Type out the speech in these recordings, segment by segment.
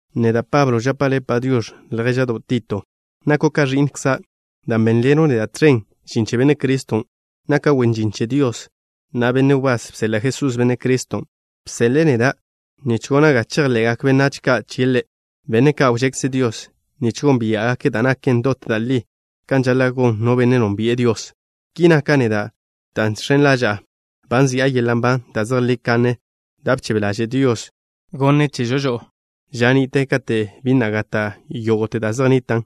Neda', Pablo, žapa' le' “Padiox̱” ljéža'do' Tito. Nako' ka ẕi'nkza' dan' bénḻeno' neda' tẕen žin che Benne' Criston'. Naka' wen žin che Dios, na' benne' wbás bseḻa' Jesús, Benne' Criston'. Bseḻe'e neda' nich gona' ga chejḻe'gak benách ka' chie' Ḻe', benne' ka' wžekze Dios, nich gónbia'gake' da' naken dot da' li kan žaḻa' gon no benne' nónbi'e Dios. Ki naka' neda' dan' žx̱en ḻaža'a ba nzi'a yeḻa' nban da' zejlí kanne da' bchebe ḻaže' Dios wneẕjwe' chežo žo'o ža ni'te kate' bi na' gata' yógo'te da' zej nnitan',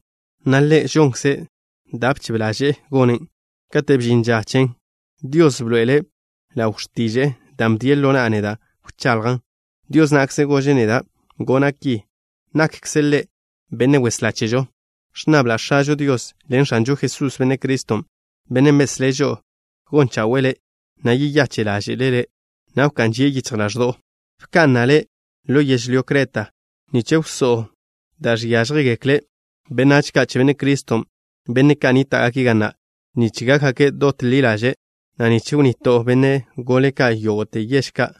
na' Ḻe' žonkze' da' bchebe ḻaže'e gonen'. Kate' bžin ža chen, Dios bḻoe'ele' ḻaw x̱tiže'e, da' bdien' ḻo na'a neda' wchaḻjan'. Dios na'kze gože' neda' gona' ki. Nakkze' Ḻe' Benne' Weslá chežo. Ẕnnabla' X̱ažo Dios ḻen X̱anžo Jesús, Benne' Criston', Bennen' beslé' žo'o, gon chawe'e le', na' yeyache' ḻáže'le' le', na' wká'n žie' yichj ḻaẕdo'o. Bka'na' le' ḻo yežlyó Creta, nich wsó'o da' žiážjegekle benách ka' che Benne' Criston', benne' ka' nníta'gake' ga na', nich gákgake' dot ḻi ḻaže', na' nich wnnito'o benne' gole ka' yógo'te yež ka',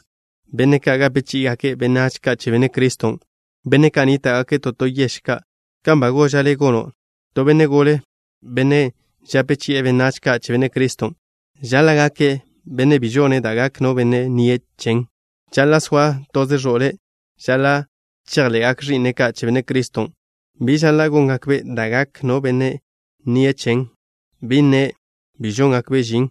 benne' ka' gape chí'igake' benách ka' che Benne' Criston', benne' ka' nníta'gake' to to yež ka', kan ba goža' le' gono'. To benne' gole, benne' žape chi'e benách ka' che Benne' Criston': Žaḻa' gake' benne' bi žone' da' gak no benne' nnie' chen. Žaḻa' soa toze ẕo'le'. Žaḻa' chejḻe'gak ẕi'ne' ka' che Benne' Criston'. (Bi žaḻa' góngakbe' da' gak no benne' nnie' chen, bi nne' bi žóngakbe' žin,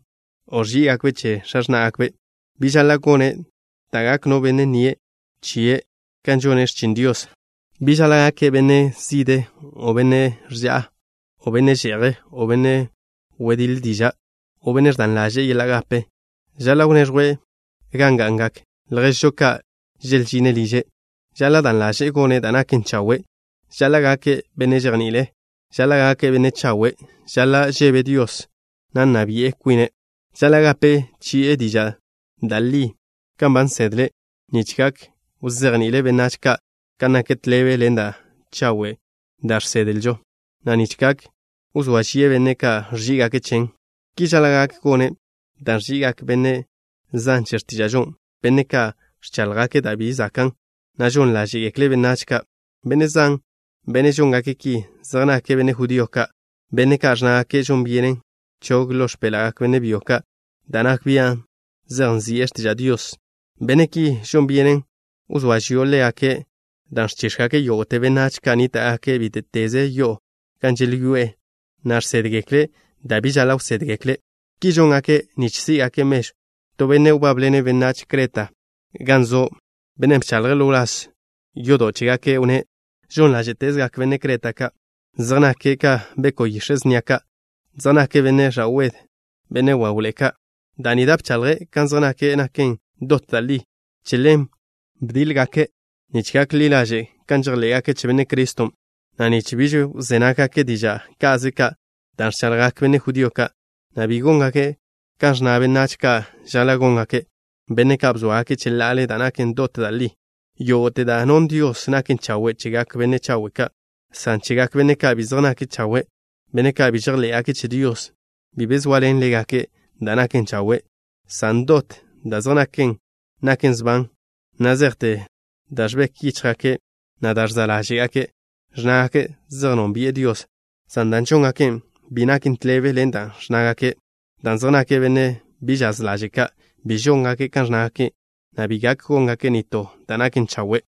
o ẕží'igakbe' che x̱a x̱ná'gakbe'.) Bi žaḻa' gone' da' gak no benne' nnie' chie' kan žone' x̱chin Dios. Bi žaḻa' gake' benne' zide, o benne' ža'a, o benne' že'je', o benne' wediḻe diža', o benne' ẕdan ḻaže'e yeḻa' gape. Žaḻa' wneẕjwe' gan ga'ngak lježžo ka' želžine' liže'. Žaḻa' dan ḻaže'e gone' da' naken chawe'. Žaḻa' gake' benne' žejni'ile'. Žaḻa' gake' benne' chawe'. Žaḻa' žebe' Dios, na' nna bia' kwine'. Žaḻa' gape chi'e diža' da' li kan ba nsedle', nich gak wzejni'ile' benách ka' kan naken tḻebe ḻen da' chawe' da' žsedlžo, na' nich gak wzóa žie' benne' ka' ẕží'igake' chen. Ki žaḻa' gak gone' dan' ẕži'igak benne' zan che x̱tíža'žo, benne' ka' ẕcháḻjgake' da' bi zakan', na' žon ḻáže'gekle' benách ka'. Benne' zan, benne' žóngake' ki, zej nake' benne' judío ka', benne' ka' ẕnnágake' žon byenen chog ḻo x̱péḻa'gak benne' byo ka' da' nak bian' zej nzi'e x̱tiža' Dios. Benne' ki, žon byenen wzóa žio' ḻégake', dan' ẕchíx̱gake' yógo'te benách ka' nníta'gake' bíte'teze yo'o gan želyoé'e, na' žsédgekle' da' bi žaḻa' wsédgekle'. Ki žóngake' nich sí'gakze' mežw. To benne' wbábḻene' benách Creta ka' gan zo', bennen' bchaḻje' ḻo wláz yodo' chégake', wnné': Žon ḻáže'tezgak benne' Creta ka'. Zej nake' ka beko' yix̱e' snia ka'. Zej nake' benne' ẕa'wed, benne' wawḻe'e ka'. Da' ni da' bchaḻje' kan zej nake' naken dot da' li. Che ḻen bdíḻ-gake' nich gak ḻi ḻaže' kan žejḻé'gake' che Benne' Criston', na' nich bi wzé nággake' diža' ka'ze ka' da' ẕchaḻjgak benne' judío ka', na' bi góngake' kan ẕnna benách ka' žaḻa' góngake', benne' ka' bzóagake' cheḻa'ale da' naken dot da' li. Yógo'te da' non Dios naken chawe' chegak benne' chawe' ka', san chegak benne' ka' bi zej nake' chawe', benne' ka' bi žejḻé'gake' che Dios, bi be zoaḻen ḻégake' da' naken chawe', san dot da' zej nake' naken sban, na' zejte da' ẕbek yíchjgake', na' da' ẕza' ḻáže'gake'. Ẕnnágake' zej nónbi'e Dios, san da' žóngake' bi naken tḻebe ḻen dan' ẕnnágake', dan' zej nake' benne' bi žaz ḻaže' ka'. Bi žóngake' kan ẕnnágake', na' bi gak góngake' nitó da' naken chawe'.